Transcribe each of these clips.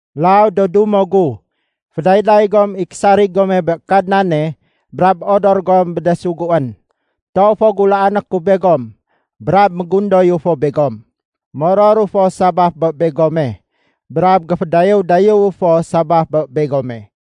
Mélaw do dumo gu, fédayday gom i késarig gome bé Kadnane brab odor gom bé de suguén. Toow fo gulaané ku begom brab mégundoyu fo begom. Mororu fo sabaf bé begome, brab géfédayéw-dayéwu fo sabaf bé begome.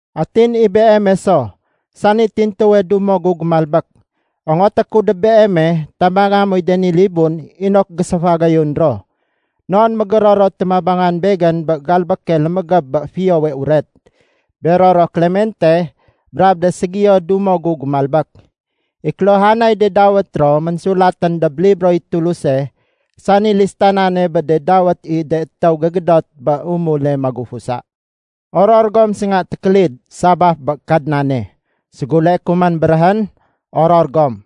Atin i beeme so, sani tintuwe dumo gu gémalbék, ongoté ku dob beeme tabanga moy de ni libun inok géséfagayun ro. Non mégéror ro téménabangan begén bé galbéke lémégéb bé Fiyowe Uret, bero ro Klemente brab de ségiyo dumo gu gémalbék. I kéluhanay de dawét ro ménsulatén dob libroy Tuluse sani listanane bé de dawét i de étéw gégédot bé umule magufusa. Oror gom sénga tékélid sabaf bé Kadnane. Séguleé ku man béréhén: Oror gom!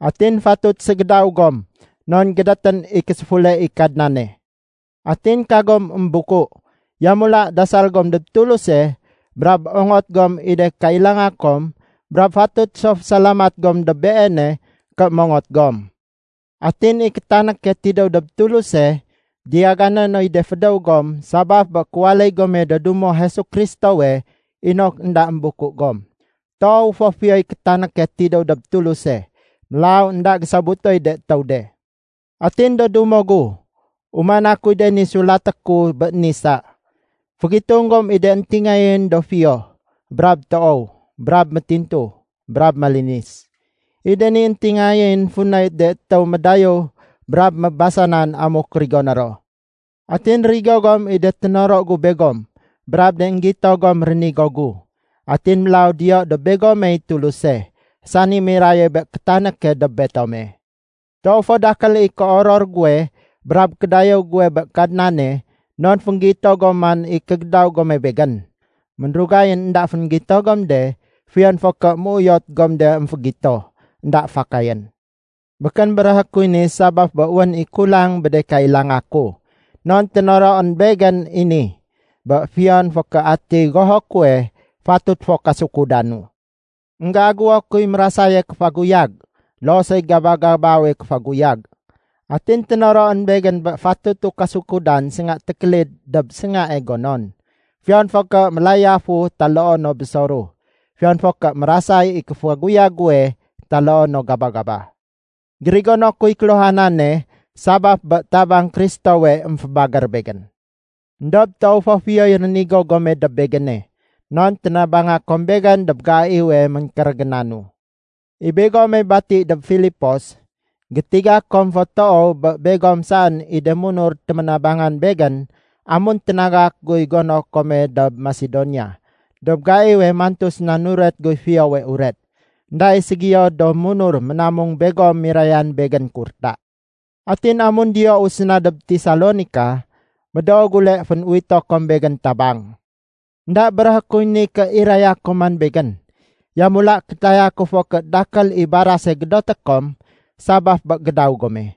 Atin fatut ségédaw gom non gédétén i késéfule i Kadnane. Atin kagom émbuku. Yamula dasal gom dob Tuluse brab ongot gom i de kailanga kom brab fatut so fésalamat gom dob Beene ké mongot gom. Atin i kétanéke tidéw dob Tuluse, diyagané noy de fédéw gom sabaf bé kéwaléy gome do dumo Jesu Kristowe inok énda émbuku gom. Toow fo fiyoy kétanéke tidéw dob Tuluse, mélaw énda gésobutoy de étéw de. Atin do dumo gu, umana kuy de ni sulaté ku bé ni sa: Fégitung gom i de éntingayén do fiyo, brab toow, brab métintu, brab malinis. I de ni éntingayén funay de étéw médayéw brab mébasanan amuk rigoné ro. Atin rigo gom i de ténoro gu begom brab de énggito gom rénigo gu. Atin mélaw diyo dob begomey Tuluse, sani miraye bé kétanéke dob betome. Toow fo dakél i kéoror guwe brab kédayéw guwe bé Kadnane non fénggito gom man i kégédaw gome begén. Ménrugayén énda fénggito gom de fiyon fo ké méuyot gom de émfégito, énda fakayén. Békén béréhé kuy ni sabaf bé wén i kulang bé de kailanga ku. Non ténoroén begén i ni, bé fiyon fo ké atiy goho kuwe, fatut fo kasukudanu. Enggéagéwo kuy mérasaye kéfaguyag loo soy gaba-gabawe kéfaguyag. Atin ténoroén begén bé fatutu kasukudan sénga tékélid dob séngae gonon, fiyon fo ké mélayafu taloo no bésoru, fiyon fo ké mérasay i kéfaguyag guwe taloo no gaba-gaba. Gérigono kuy kéluhanane sabaf bé tabang Kristowe émfébagér begén. Endob toow fo fiyoy rénigo gome dob begéne, non ténabanga kom begén dob gaiwe ménkérégénanu. I begome bati dob Filipos, gétiga kom fo toow bé begom saén i de munur téménabangan begén amun ténagak guy gono kome dob Masedonia dob gaiwe mantu séna nuret guy Fiyowe Uret. Enda i ségiyo do munur ménamung begom mirayan begén kurta. Atin amun diyou séna dob Tesalonika, médoo gule fén-uwito kom begén tabang. Enda béréhé kuy ni ké iraya kom man begén. Yamula kétaya ku fo ké dakél i barase gédoté kom sabaf bé gédaw gome.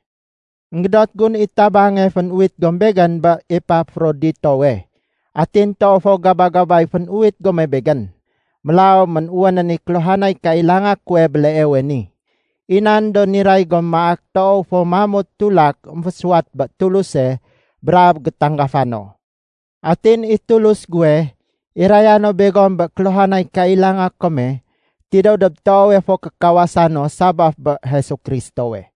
Enggédot gun i tabange fénuwit gom begén bé Epafroditowe. Atin toow fo gaba-gabay fénuwit gome begén. Mélaw ménwénén i kéluhanay kailanga kuwe béleewe ni. I nan do niray gom maak toow fo mamut tulak émfésuwat bé Tuluse brab gétanggafa no. Atin i Tulus guwe, iraya no begom bé kéluhanay kailanga kome tidéw dob toowe fo kékawasa no sabaf bé Jesu Kristowe.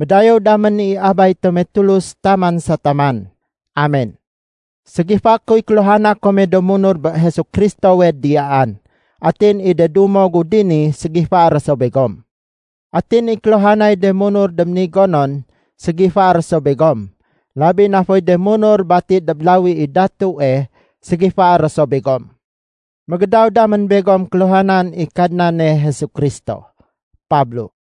Médayéw damén i Abay tome Tulus taman sa taman. Amen. Ségifaé kuy kéluhana kome do munur bé Jesu Kristowe diyaan. Atin i de dumo gu dini ségifaé ro so begom. Atin i kéluhanay de munur dob ni gonon ségifaé ro so begom, labi na foy de munur bati dob lawi i datue ségifaé ro so begom. Mégédaw damén begom kéluhanan i Kadnane Jesu Kristo. Pablo